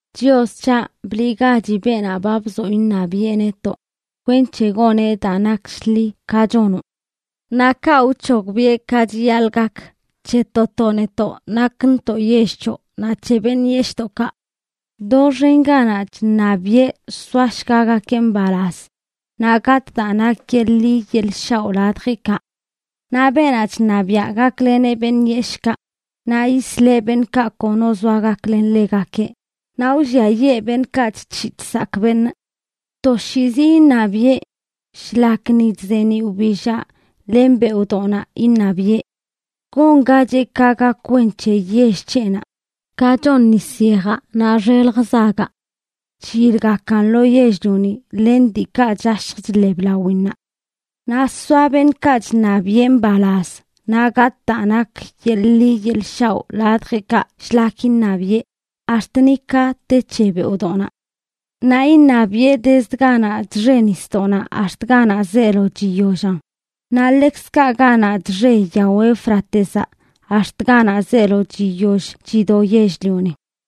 Chios c̱haꞌ, bliꞌgachi beenaꞌ ba bzoꞌ iṉabiꞌe netoꞌ kwenc̱he goneꞌ daa nak shḻi, ka chonoꞌ. Naꞌ kaꞌ wc̱hogbiꞌe ka chiyaḻꞌ gak c̱he to to netoꞌ nakntoꞌ yell c̱hoꞌ naꞌ c̱he beṉꞌ yeshꞌdoꞌkaꞌ. Doxen ganaꞌ chṉabiꞌe soashgagakeꞌ mbalaz naꞌ gatꞌ daa nak yeḻꞌ ḻi yeḻꞌ shaoꞌ ladjeꞌkaꞌ. Naꞌ beenaꞌ chṉabiaꞌ gakleneꞌ beṉꞌ yeshꞌkaꞌ, naꞌ yisleꞌ beṉꞌkaꞌ kono zoa gaklen ḻegakeꞌ, naꞌ wlliayee beṉꞌkaꞌ chc̱hiꞌ chsakꞌ beṉꞌ. Toshiizi iṉabiꞌe. Shlak ni chzeeniꞌ wbillaꞌ len beoꞌdoꞌnaꞌ iṉabiꞌe. Gongacheꞌ ka gak wen c̱he yell c̱heꞌnaꞌ, ka chon nis yejaꞌ naꞌ xelj zagaꞌ, chyilgakan lo yell-lioni len diikaꞌ chashj chḻeb lawinnaꞌ. Naꞌ soa beṉꞌkaꞌ chṉabiꞌe mbalaz naꞌ gatꞌ daa nak yeḻꞌ ḻi yeḻꞌ shaoꞌ ladjeꞌkaꞌ shlak iṉabiꞌe, ax̱t ni ka te c̱he beoꞌdoꞌnaꞌ. Naꞌ iṉabiꞌe dezd ganaꞌ chxe nisdoꞌnaꞌ ax̱t ganaꞌ zeelo chiyollan, naꞌ ḻekzkaꞌ ganaꞌ chxe yao Éufratezaꞌ ax̱t ganaꞌ zeelo chiyoll chido yell-lioni.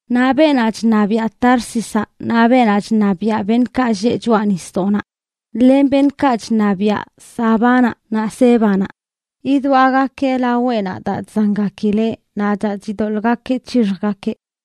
Naꞌ beenaꞌ chṉabiaꞌ Társizaꞌ naꞌ beenaꞌ chṉabiaꞌ beṉꞌkaꞌ lleꞌ choꞌa nisdoꞌnaꞌ, len beṉꞌkaꞌ chṉabiaꞌ Sabánaꞌ naꞌ Sébanaꞌ, yidwaꞌgakeꞌ laweꞌnaꞌ daa chzangakileꞌ naꞌ daa chidoḻꞌgakeꞌ c̱hixjgakeꞌ.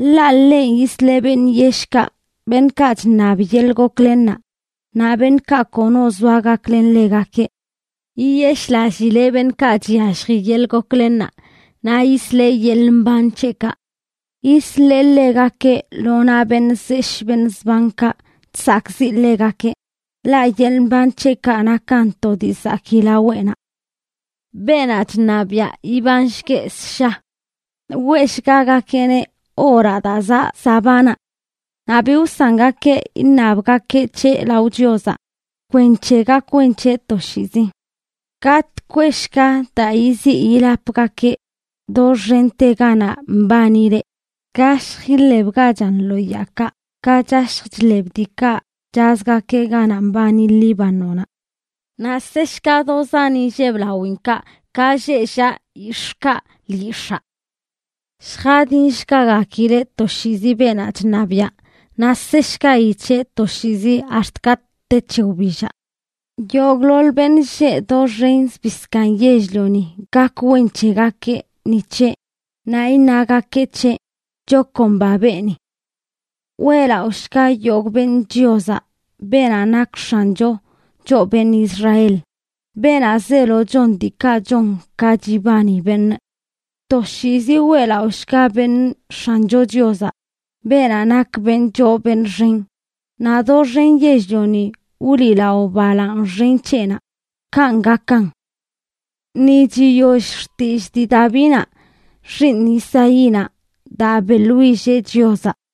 Ḻaꞌ ḻenꞌ yisleꞌ beṉꞌ yeshꞌkaꞌ, beṉꞌkaꞌ chṉab yeḻꞌ goklennaꞌ, naꞌ beṉꞌkaꞌ kono zoa gaklen ḻegakeꞌ. Yiyeshꞌlallileꞌ beṉꞌkaꞌ chyallji yeḻꞌ goklennaꞌ naꞌ yisleꞌ yeḻꞌ mban c̱heꞌkaꞌ. Yisleꞌ ḻegakeꞌ lo naꞌ beṉꞌ zeshꞌ beṉꞌ zbankaꞌ chsakꞌziꞌ ḻegakeꞌ, ḻaꞌ yeḻꞌ mban c̱heꞌkaꞌ nakan to dii zakii laweꞌnaꞌ. ¡Beenaꞌ chṉabiaꞌ ibanshgueꞌ ssha! Weꞌshgagakeꞌneꞌ oraꞌ daa zaꞌ Sabánaꞌ. Naꞌ bi wsangakeꞌ iṉabgakeꞌ c̱heꞌ lao Chiozaꞌ kwenc̱he gak wen c̱heꞌ toshiizi. Gatꞌ kweꞌshga daa yiziꞌ yilapgakeꞌ doxente ganaꞌ mbanileꞌ; gashj iḻebgachan lo yaakaꞌ, ka chashj chḻeb diikaꞌ chazgakeꞌ ganaꞌ mbani Líbanonaꞌ; naꞌ seshga do zan inlleb lawinkaꞌ ka lleꞌ llaꞌ yix̱ꞌkaꞌ lyix̱aa. Lljadinshgagakileꞌ toshiizi beenaꞌ chṉabiaꞌ, naꞌ seshgayi c̱heꞌ toshiizi ax̱t katꞌ te c̱he wbillaꞌ. Yogꞌḻoḻ beṉꞌ lleꞌ doxen zbii zkaaṉ yell-lioni gak wen c̱hegakeꞌ ni c̱heꞌ, naꞌ iṉagakeꞌ c̱heꞌ: “¡Chakomba beeni!” Weꞌlaꞌoshga yogꞌ beṉꞌ Chiozaꞌ, beenaꞌ nak X̱ancho, choꞌ beṉꞌ Israel, beenaꞌ zeelo chon diikaꞌ chon ka chibani beṉꞌ. Toshiizi weꞌlaꞌoshga beṉꞌ X̱ancho Chiozaꞌ, beenaꞌ nak beṉꞌ choo beṉꞌ xen, naꞌ doxen yell-lioni wliꞌlao balaaṉ xen c̱heꞌnaꞌ. Kanꞌ gakan. Ni chiyoll xtillꞌ dii Davínaꞌ, xiiṉ Isaínaꞌ, daa beꞌḻwilleꞌ Chiozaꞌ.